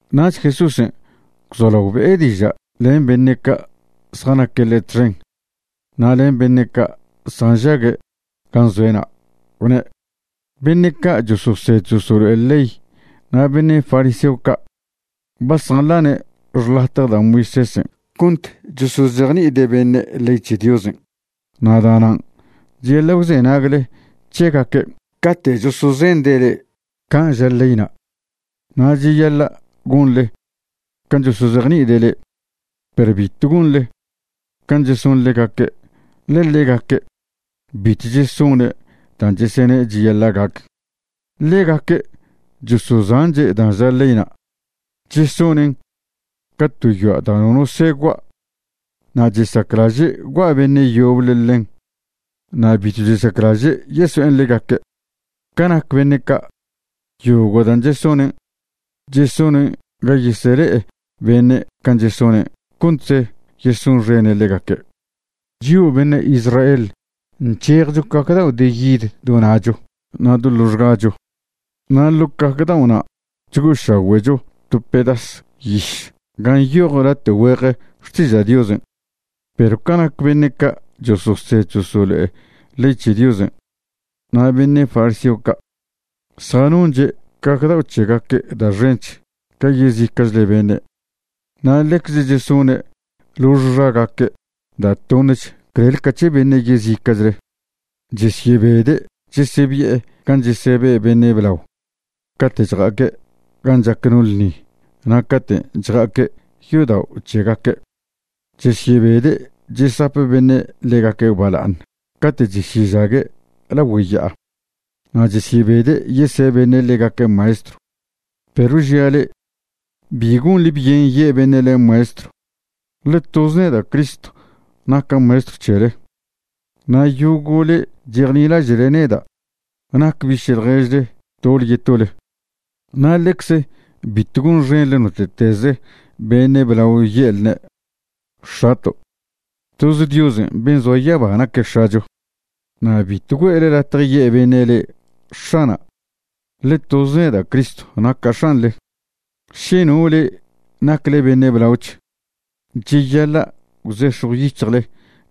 Nach Jesúsen' gwzolao be'e diža' len beṉe' ca' zjanaque' ḻe' txen na' len beṉe' ca' zjanžague' gan' zoe'na', gwne': ―Beṉe' ca' chososed chosolo'e ley na' beṉe' fariseo ca' ba zjanḻane' xḻatje da' Moisésen' cont chosozejni'ide' beṉe' ley c̱he Diosen'. Na' da'nan' cheyaḻa' gwzenagle c̱hegaque' cate' chosozende' le'e can' ža leyna', na' cheyaḻa' gonḻe can' chosozejni'ide' le'e. Perw bitw gonḻe can' cheson ḻegaque', ḻe ḻegaque' bitw chesone' dan' chesene' cheyaḻa' gac. Ḻegaque' chosozanche' dan' ža leyna'. Chesonen' ca to yoa' da' nono soe gua' na' chesaclaže' gua' beṉe' yoble ḻen na' bitw chesaclaže' yeso'en ḻegaque'. Ca nac beṉe' ca', yogo' dan' chesonen', chesonen' ga yesele'e beṉe' can' chesonen' contze yesonxene' ḻegaque'. Chio' beṉe' Israel nc̱hejcho caj dao' de yid do na'cho na' do loxgacho na' ḻo' caj dao'na' chgo'ošagüe'cho to pedas yiš gan' nyoj late' güeje Xtiža' Diosen'. Perw ca nac beṉe' ca' chososed chosolo'e ley c̱he Diosen' na' beṉe' fariseo ca', zjanonche' caj dao' c̱hegaque' da' xench ca yezica'chle beṉe'. Na' ḻecze chesone' lox xagaque' da' toṉech clel ca c̱he beṉe' yezica'chle. Chesyebede' chesebi'e gan' chesebe' beṉe' blao cate' chja'aque' gan' chac no ḻṉi na' cate' chja'aque' yodao' c̱hegaque'. Chesyebede' chesap beṉe' ḻegaque' bala'aṉ cate' chesyežague' lagüe ya'a. Na' chesyebede' yese' beṉe' ḻegaque' maestrw. ’Perw žia' le'e, bi gonḻe byen ye' beṉe' le'e maestrw, ḻe toz neda' Cristo naca' Maestrw c̱hele. Na' yogo' le'e chejnilaže'le neda' nac biše' ḻježle tole yetole. Na' ḻecze bitw gonxenḻe note'teze beṉe' blao ye'lne': “X̱ato'”. Toze Diosen' ben' zoa yaba naque' X̱acho. Na' bitw güe'le latje ye' beṉe' le'e: “X̱ana'”, ḻe toz neda' Cristo naca' X̱anḻe. Še no le'e nacle beṉe' blaoch, cheyaḻa' gwzex̱jw yic̱hjle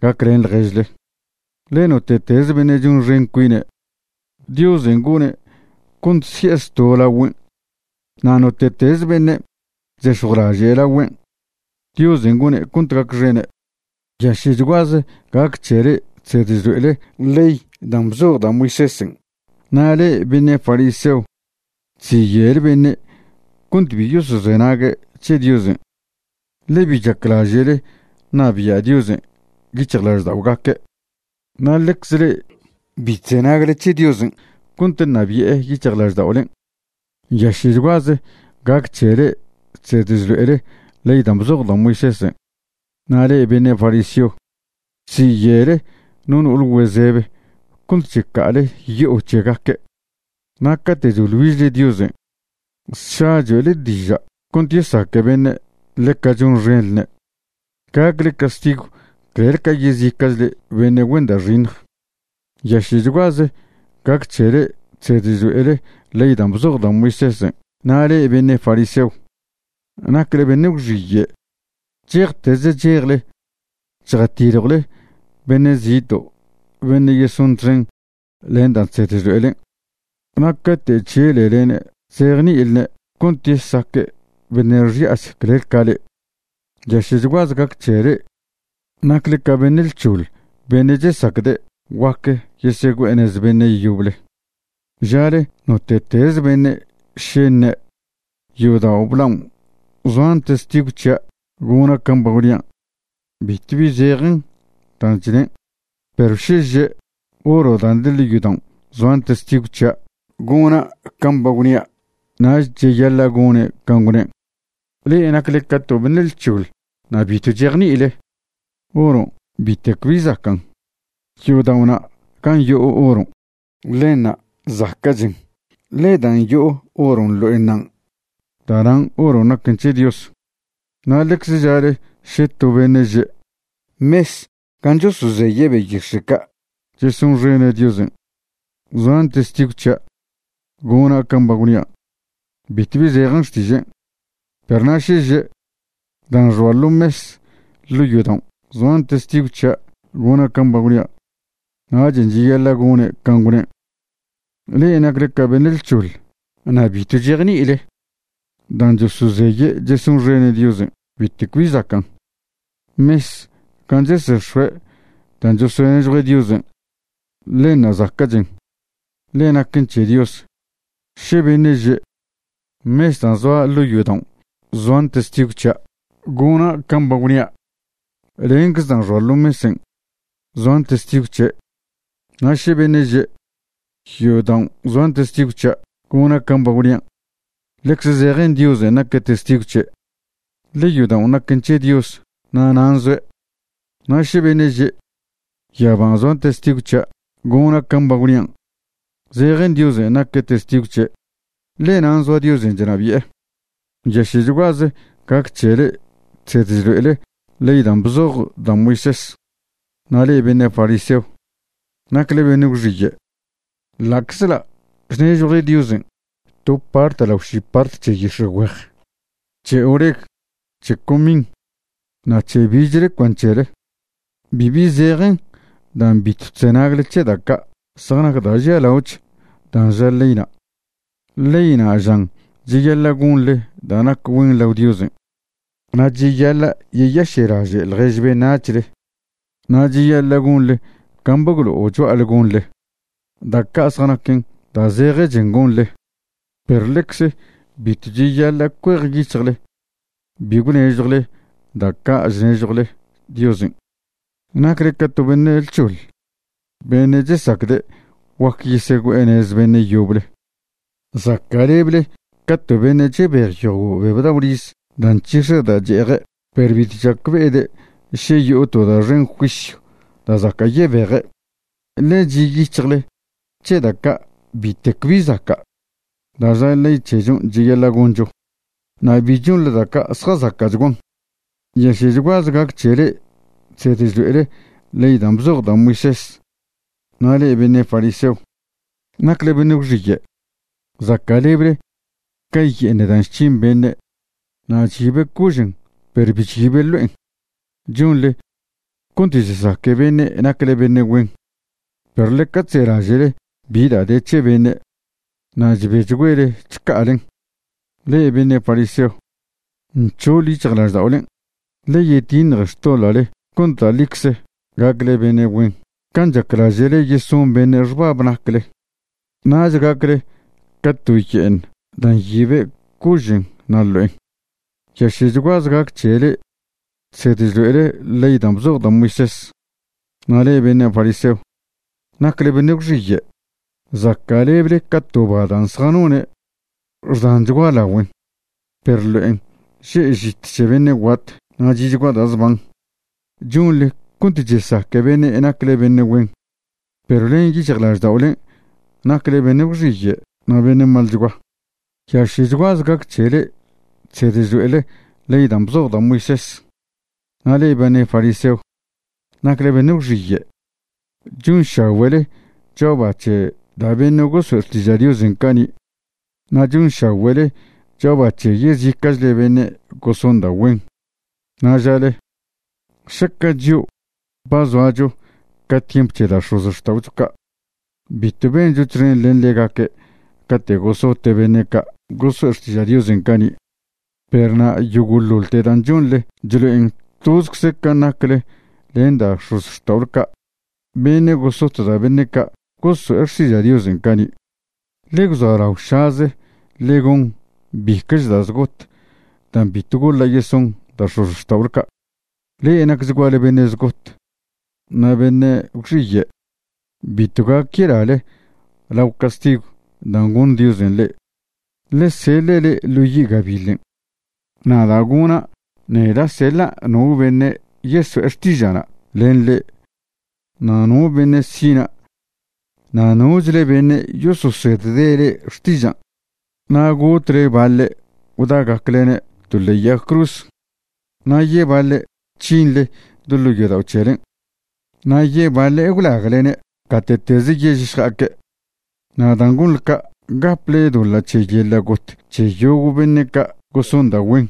gaclen ḻježle. Ḻe note'teze beṉe' chonxen cuine', Diosen' gone' cont si'e zto' lagüen'. Na' note'teze beṉe' chzex̱jwlaže' lagüen', Diosen' gone' cont gacxene'. ’¡Nyaše'chguaze gac c̱he le'e chsed chlo'ele ley dan' bzoj da' Moisésen' na' le'e beṉe' fariseo! Chziye'le beṉe' cont bi yosozenague' c̱he Diosen', ḻe bi chaclaže'le ṉabia' Diosen' yic̱hjlažda'ogaque', na' ḻecze le'e bi chzenagle c̱he Diosen' cont ṉabi'e yic̱hjlažda'olen'. ’¡Nyaše'chguaze gac c̱he le'e chsed chlo'ele ley dan' bzoj da' Moisésen' na' le'e beṉe' fariseo! Chziye'le no no'ole güezebe cont checa'ale yo'o c̱hegaque'. Na' cate' choḻ güižle Diosen', sša choe'le diža' cont yesaque beṉe' ḻeca chonxenḻne'. Gacchle castigw clel ca yezica'chle beṉe' güen da' xiṉj. ’¡Nyaše'chguaze gac c̱he le'e chsed chlo'ele ley dan' bzoj da' Moisésen' na' le'e beṉe' fariseo! ¡Nacle beṉe' gwxiye'! Chejtez chejle chjatiljwle beṉe' zito' beṉe' yeson txen len dan' chsed chlo'elen'. Na' cate' chželelene' chzejni'ilne' cont yesaque' beṉe' xi'ach clel ca le'e. ’¡Nyaše'chguaze gac c̱he le'e! ¡Nacle ca beṉe' lc̱hoḻ beṉe' chesacde' guac yesegüe'e nez beṉe' yoble! Žale note'teze beṉe' še ṉe': “Yodao' blaon' zoan testigw c̱hia' gona' can' ba gwnia'”, bitwbi zejen dan' chnen'. Perw še že': “Oro dan' de ḻo' yodaon' zoan testigw c̱hia' gona' can' ba gwnia'”, nach cheyaḻa' gone' can' gwnen'. ¡Le'e nacle ca to beṉe' lc̱hoḻ na' bitw chejni'ile! Oron' bitec bi zacan'. Yodao'na' gan' yo'o oron' ḻenṉa' zaca'chen, ḻe dan' yo'o oron' ḻo'enṉan', da'nan' oron' naquen c̱he Dios. Na' ḻecze žale še to beṉe' že': “Mes gan' chosozeye' beyix̱e' ca' chesonxene' Diosen', zoan testigw c̱hia' gona' can' ba gwnia'”, bitwbi zejen xtižen'. Perw na' še že': “Dan' xoa ḻo mes ḻo' yodaon' zoan testigw c̱hia' gona' can' ba gwnia'”, nachen' cheyaḻa' gone' can' gwnen'. ¡Le'e nacle ca beṉe' lc̱hoḻ na' bitw chejni'ile! Dan' chosozeye' chesonxene' Diosen' bitec bi zacan'. Mes gan' chesex̱oe' dan' chosonežjue' Diosen', ḻenṉa' zaca'chen, ḻe naquen c̱he Dios. Še beṉe' že': “Mes dan' zoa ḻo' yodaon' zoan testigw c̱hia' gona' can' ba gwnia'”, lencze dan' xoa ḻo mesen' zoan testigw c̱he'. Na' še beṉe' že': “Yodaon' zoan testigw c̱hia' gona' can' ba gwnia'”, ḻecze zejen Diosen' naque' testigw c̱he', ḻe yodaon' naquen c̱he Dios na' nan' zoe'. Na' še beṉe' že': “Yaban' zoan testigw c̱hia' gona' can' ba gwnian'”, zejen Diosen' naque' testigw c̱he', ḻe nan' zoa Diosen' chnabi'e. ’¡Nyaše'chguaze gac c̱he le'e chsed chlo'ele ley dan' bzoj da' Moisés na' le'e beṉe' fariseo! ¡Nacle beṉe' gwxiye'! Ḻa'czḻa' chnežjwle Diosen' to part lao ši part c̱he yix̱egüej, c̱he oreg, c̱he comin, na' c̱he bichle cuan c̱hele, bibi zejen dan' bitw chzenagle c̱he da' ca' zjanac da' žialaoch dan' ža leyna'. Leyna' žan cheyaḻa' gonḻe da' nac güen lao Diosen', na' cheyaḻa' yeyaše'laže' ḻjež beṉac̱hle na' cheyaḻa' gonḻe can' ba gwlo'o cho'ale gonḻe. Da' ca' zjanaquen da' zejechen gonḻe, perw ḻecze bitw cheyaḻa' cuejyic̱hjle bi gwnežjwle da' ca' chnežjwle Diosen'. ¡Nacle ca to beṉe' lc̱hoḻ beṉe' chesacde' guac yesegüe'e nez beṉe' yoble! Zaca'lebele ca to beṉe' chebej yogo' beb dao' riz da' nc̱hix̱e da' che'eje' perw bitw chacbe'ede' še yo'o to da' xen juisyw da' zaca' yebeje'. Ḻe chi' yic̱hjle c̱he da' ca' bitec bi zaca' da' ža ley c̱hechon' cheyaḻa' goncho, na' bi chonḻe da' ca' zjazaca'chguan. ’¡Nyaše'chguaze gac c̱he le'e chsed chlo'ele ley dan' bzoj da' Moisés na' le'e beṉe' fariseo! ¡Nacle beṉe' gwxiye'! Zaca'leble ca ye'eṉ dan' chc̱hin beṉe' na' chyibe' cožen' perw bi chyibe' ḻo'en. Chonḻe cont chesaque beṉe' nacle beṉe' güen, perw ḻeca chzelaže'le bi da' de c̱he beṉe' na' chbechgüele chca'alen. ¡Le'e beṉe' fariseo, nc̱hoḻ yic̱hjlažda'olen'! Ḻe yetiṉje xtoḻa'le cont da' ḻicze gacle beṉe' güen can' chaclaže'le yeson beṉe' xbab nacle. Nach gacle ca to ye'eṉ dan' nyibe' cožen' na' ḻo'en. ’¡Nyaše'chguaze gac c̱he le'e chsed chlo'ele ley dan' bzoj da' Moisés na' le'e beṉe' fariseo! ¡Nacle beṉe' gwxiye'! Zaca'leble ca to ba dan' zjanone' xdanchgua lagüen perw ḻo'en že' žit c̱he beṉe' guat na' chi'chgua da' zban. Chonḻe cont chesaque beṉe' nacle beṉe' güen, perw len yic̱hjlažda'olen' nacle beṉe' gwxiye' na' beṉe' malchgua. ’¡Nyaše'chguaze gac c̱he le'e chsed chlo'ele ley da' bzoj da' Moisés na' le'e beṉe' fariseo! ¡Nacle beṉe' gwxiye'! Chonšagüe'le cho'a ba c̱he da' beṉe' goso'e xtiža' Diosen' cani', na' chonšagüe'le cho'a ba c̱he yezica'chle beṉe' goson da' güen. Na' žale: “Šaca' chio' ba zoacho ca tiemp c̱he da' x̱ozxta'ocho ca', bitw bencho txen len ḻegaque' cate' gosote' beṉe' ca' goso'e xtiža' Diosen' cani'.” Perw na' yogo'ḻoḻte dan' chonḻe chlo'en tozcze can' nacle len da' x̱ozxta'ole ca' beṉe' gosot da' beṉe' ca' goso'e xtiža' Diosen' cani'. Ḻe gwza'laošaze ḻe gon bica'ch da' zgot dan' bitw goḻa' yeson da' x̱ozxta'ole ca'. ’Le'e nacchguale beṉe' zgot na' beṉe' gwxiye'. Bitw gac yelale lao castigw dan' goṉ Diosen' le'e, ḻe seḻe' le'e ḻo yi' gabiḻen'. Na' da' gona', neda' seḻa' no beṉe' yeso'e xtiža'na' len le'e na' no beṉe' sina' na' nochle beṉe' yososedde' le'e xtižan'. Na' gotle baḻe' gwda'gaclene' to ḻe'e yag cruz, na' yebaḻe' c̱hinḻe do ḻo' yodao' c̱helen', na' yebaḻe' gwlaglene' gate'teze yež šja'aque'. Na' dan' gonḻe ca' gaple doḻa' c̱he yeḻa' got c̱he yogo' beṉe' ca' goson da' güen,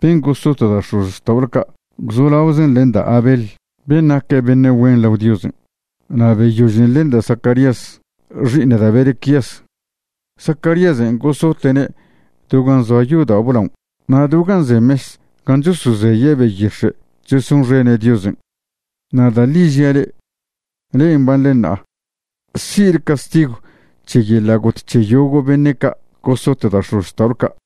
ben' gosot da' x̱ozxta'ole ca' gwzolaozen len da' Abel ben' naque' beṉe' güen lao Diosen' na' beyožen len da' Zacarías xi'iṉ da' Berequías. Zacaríasen' gosote'ne' do gan' zoa yodao' blaon' na' do gan' ze mes gan' chosozeye' beyix̱e' chesonxene' Diosen'. Na' da' ḻi žia' le'e, le'e mbanḻe ṉa'a si'le castigw c̱he yeḻa' got c̱he yogo' beṉe' ca' gosot da' x̱ozxta'ole ca'.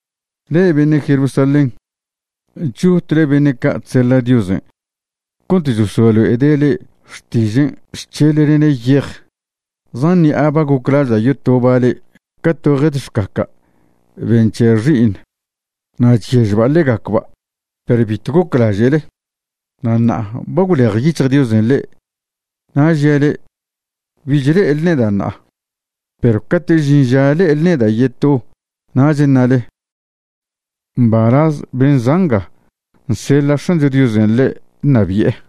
’Le'e beṉe' Jerusalén, chotle beṉe' ca' chseḻa' Diosen' cont chesoe'lene' le'e xtižen' chc̱heḻlene' yej. Zan ṉi'a ba goclaža' yotoba' le'e ca to jed xcaca' ben' nc̱he' xi'iṉ na' chyežba' ḻegacba', perw bitw goclaže'le. Na' ṉa'a ba gwlejyic̱hj Diosen' le'e. Na' žia' le'e, bich le'ele neda' ṉa'a, perw cate'ch žin ža le'ele neda' yeto nach ṉale: “Mbalaz ben' za' nga nseḻa' X̱ancho Diosen' ḻe' ṉabi'e”.